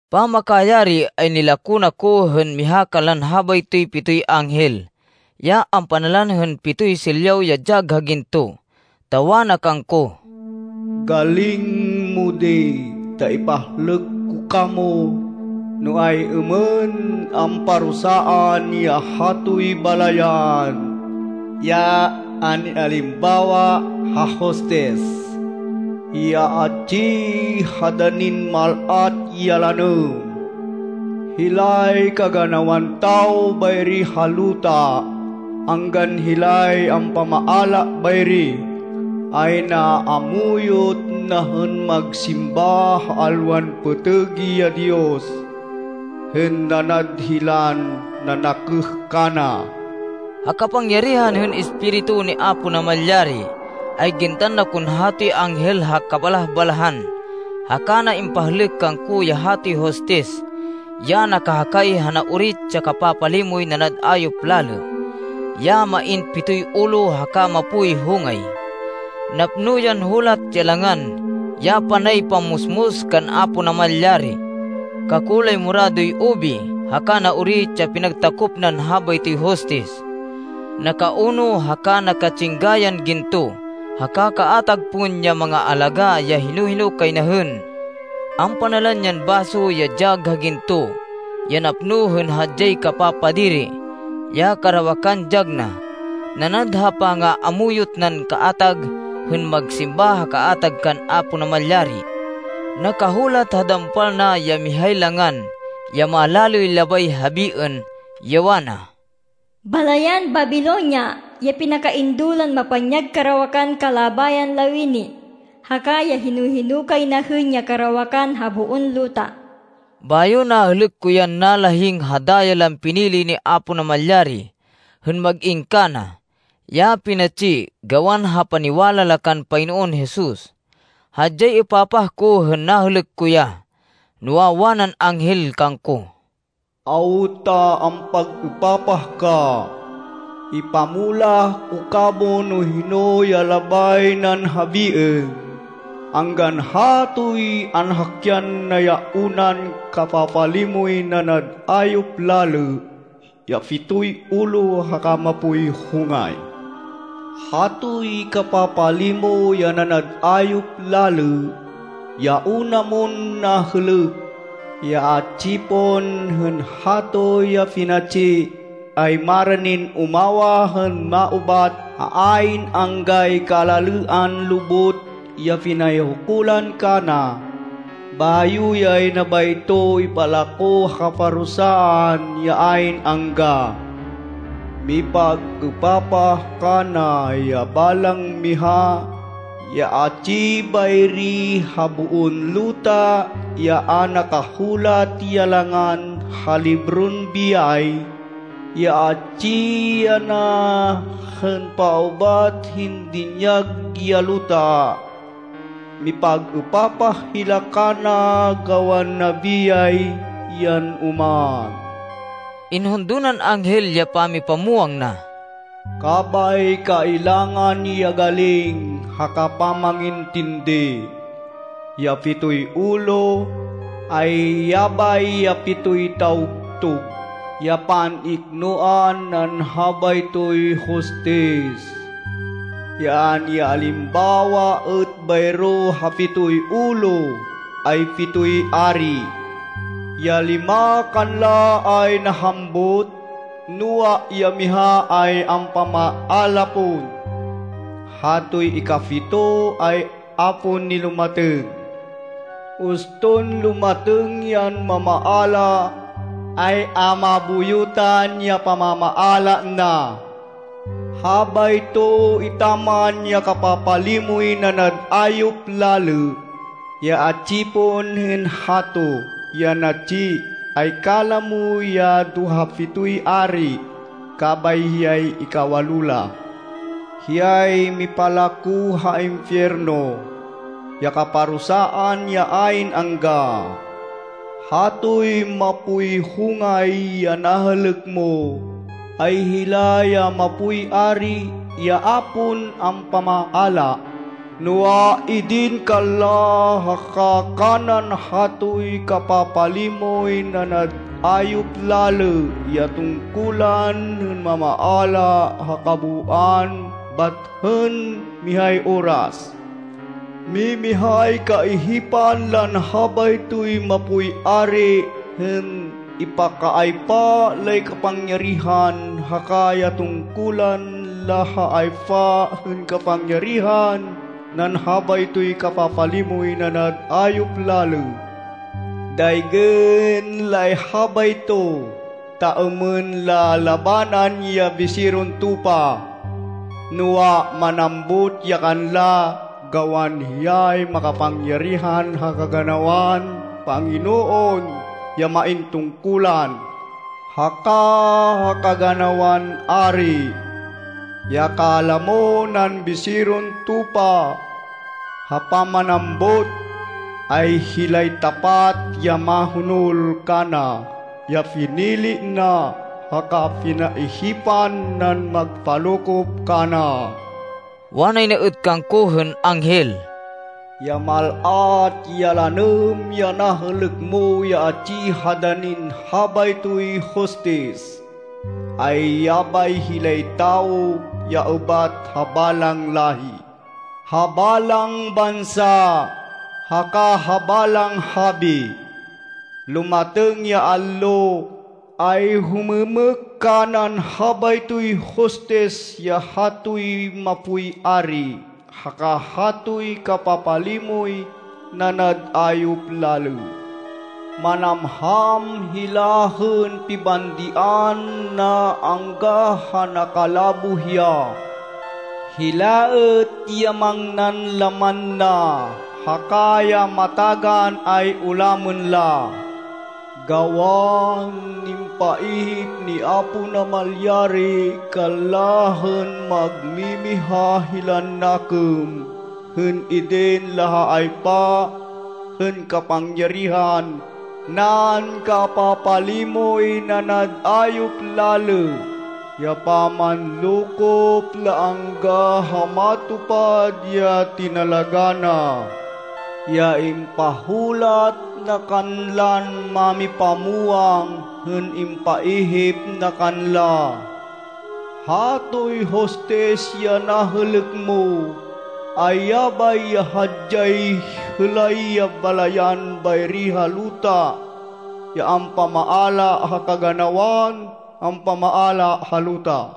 Pamakayari, ay nilako na ko hên miha kanlan habaytoy pitoy anghel ya ampanalan hên pitoy silyaw ya dyag ha ginto, ta wana kangko, “Galing mo di, ta ipahlêk ko kamo, no ay-êmên amparusaan ya hatoy balayan, ya an-ialimbawa ha hostis, ya atsi ha danin mal-at ya lanêm. Hilay kaganawan tawo bayri ha luta anggan hilay ampamaala bayri, ay naamuyot na hên magsimba ha alwan pêtêg ya diyos, hên nanad hilan nanakêh kana.” Ha kapangyarihan hên Espiritu ni Apo Namalyari, ay gintan na kon hatoy anghel ha kabalah-balahan, haka na impahlêk kangko ya hatoy hostis ya nakahakay ha naorit ya kapapalimoy nanad ayop lalê, ya main pitoy ulo haka mapoy hongay. Napno yan hulat, ya langan, ya panay pamusmus kan Apo Namalyari. Kakulay moradoy ubi haka naorit ya pinagtakop nan habaytoy hostis. Nakauno haka naka-tsingga yan ginto haka kaatag pon ya mangaalagá ya hino-hino kay na hên. Ampanalan yan baso ya dyag ha ginto, ya napno hên hadyay kapapadiri, ya karawakan dyag na, nanad ha pangaamuyot nan kaatag hên magsimba ha kaatag kan Apo Namalyari. Nakahulat ha dampal na ya mihay langan ya malalêy labay habiên, ya wana, “Balayan Babilonia ya pinakaindo lan mapanyag karawakan kalabayan lawini, haka ya hino-hino kay na hên ya karawakan ha boon luta.” Bayo nahêlêk ko yan nalahing ha daya lan pinili ni Apo Namalyari hên mag-in kana, ya pinatsi gawan ha paniwala la kan Panginoon Jesus. Hadyay êpapah ko hên nahêlêk ko ya. Noa, wanan anghel kangko, “Awta ampag-êpapah ka? Ipamulah ko kamo no hino ya labay nan habiên, anggan hatoy anhakyan na ya unan kapapalimoy nanad ayop lalê ya pitoy ulo haka mapoy hongay. Hatoy kapapalimo ya nanad ayop lalê, ya una mon nahêlêk, ya atsi pon hên hato ya pinatsi, ay maranin umawah hên maubat ha ayn anggay kalalêan lubot ya pinayhukulan kana, bayo yay na bayto ipalako ha kaparusaan ya ayn angga. Mipag-êpapah kana ya balang miha ya atsi bayri ha boon luta ya a nakahulat ya langan ha libron biyay, ya atsi yana hên paubat hên dinyag ya luta. Mipag-êpapah hila kana gawan nabiyay yan oman.” Inhundo nan anghel ya pamipamwang na, “Kabay kailangan ya galing haka pamangintindi. Ya pitoy ulo, ay yabay ya pitoy tawgtug ya pan-iknoan nan habaytoy hostis. Ya an-ialimbawa êt bayro ha pitoy ulo, ay pitoy ari. Ya lima kanla ay nahambut, noa, ya miha ay ampamaala pon. Hatoy ikapito, ay a pon nilumatêng. Uston lumatêng yan mamaala, ay a mabuyutan ya pamamaala na. Habayto etaman ya kapapalimoy nanad ayop lalê, ya atsi pon hên hato, ya natsi, ay kalamo ya do ha pitoy ari, kabay hiyay ikawalo la. Hiyay mipalako ha impiyerno, ya kaparusaan ya ayn angga. “Hatoy mapoy hongay ya nahêlêk mo, ay hila ya mapoy ari ya a pon ampamaala, noa, idin kanla haka kanan hatoy kapapalimoy nanad ayop lalê ya tungkulan hên mamaala ha kabooan bat hên mihay oras. Mimihay kaihipan lan habaytoy mapoy ari hên ipakaaypa lay kapangyarihan haka ya tungkulan la ha aypa hên kapangyarihan nan habaytoy kapapalimoy nanad ayop lalê. Daygên lay habayto, ta êmên la labanan ya Biseron Tupa. Noa, manambut ya kanla gawan hiyay makapangyarihan ha kaganawan panginoon ya main tungkulan, haka ha kaganawan ari. Ya kalamo nan Biseron Tupa ha pamanambut, ay hilay tapat ya mahonol kana, ya pinili na, haka pinaihipan nan magpalokop kana.” Wanay na êt kangko hên anghel, “Ya mal-at ya lanêm ya nahêlêk mo ya atsi ha danin habaytoy hostis, ay yabay hilay tawo ya ubat ha balang láhi, ha balang bansa, haka ha balang habi. Lumatêng ya allo, ay humêmêk kanan habaytoy hostis ya hatoy mapoy ari haka hatoy kapapalimoy nanad ayop lalê. Manamham hila hên pibandian na angga ha nakalaboh ya. Hila êt ya mangnan laman na, haka ya matagan ay ulamên la. Gawan impaihip ni Apo Namalyari kanla hên magmimiha hilan nakêm hên idin la ha aypa hên kapangyarihan nan kapapalimoy nanad ayop lalê, ya pamanlokop la angga ha matupad ya tinalagá na, ya impahulat na kanlan mámipamwang hên impaihip na kanla. “Hatoy hostis ya nahêlêk mo, ay yabay ya hadyay hêlay ya balayan bayri ha luta ya ampamaala ha kaganawan ampamaala ha luta.”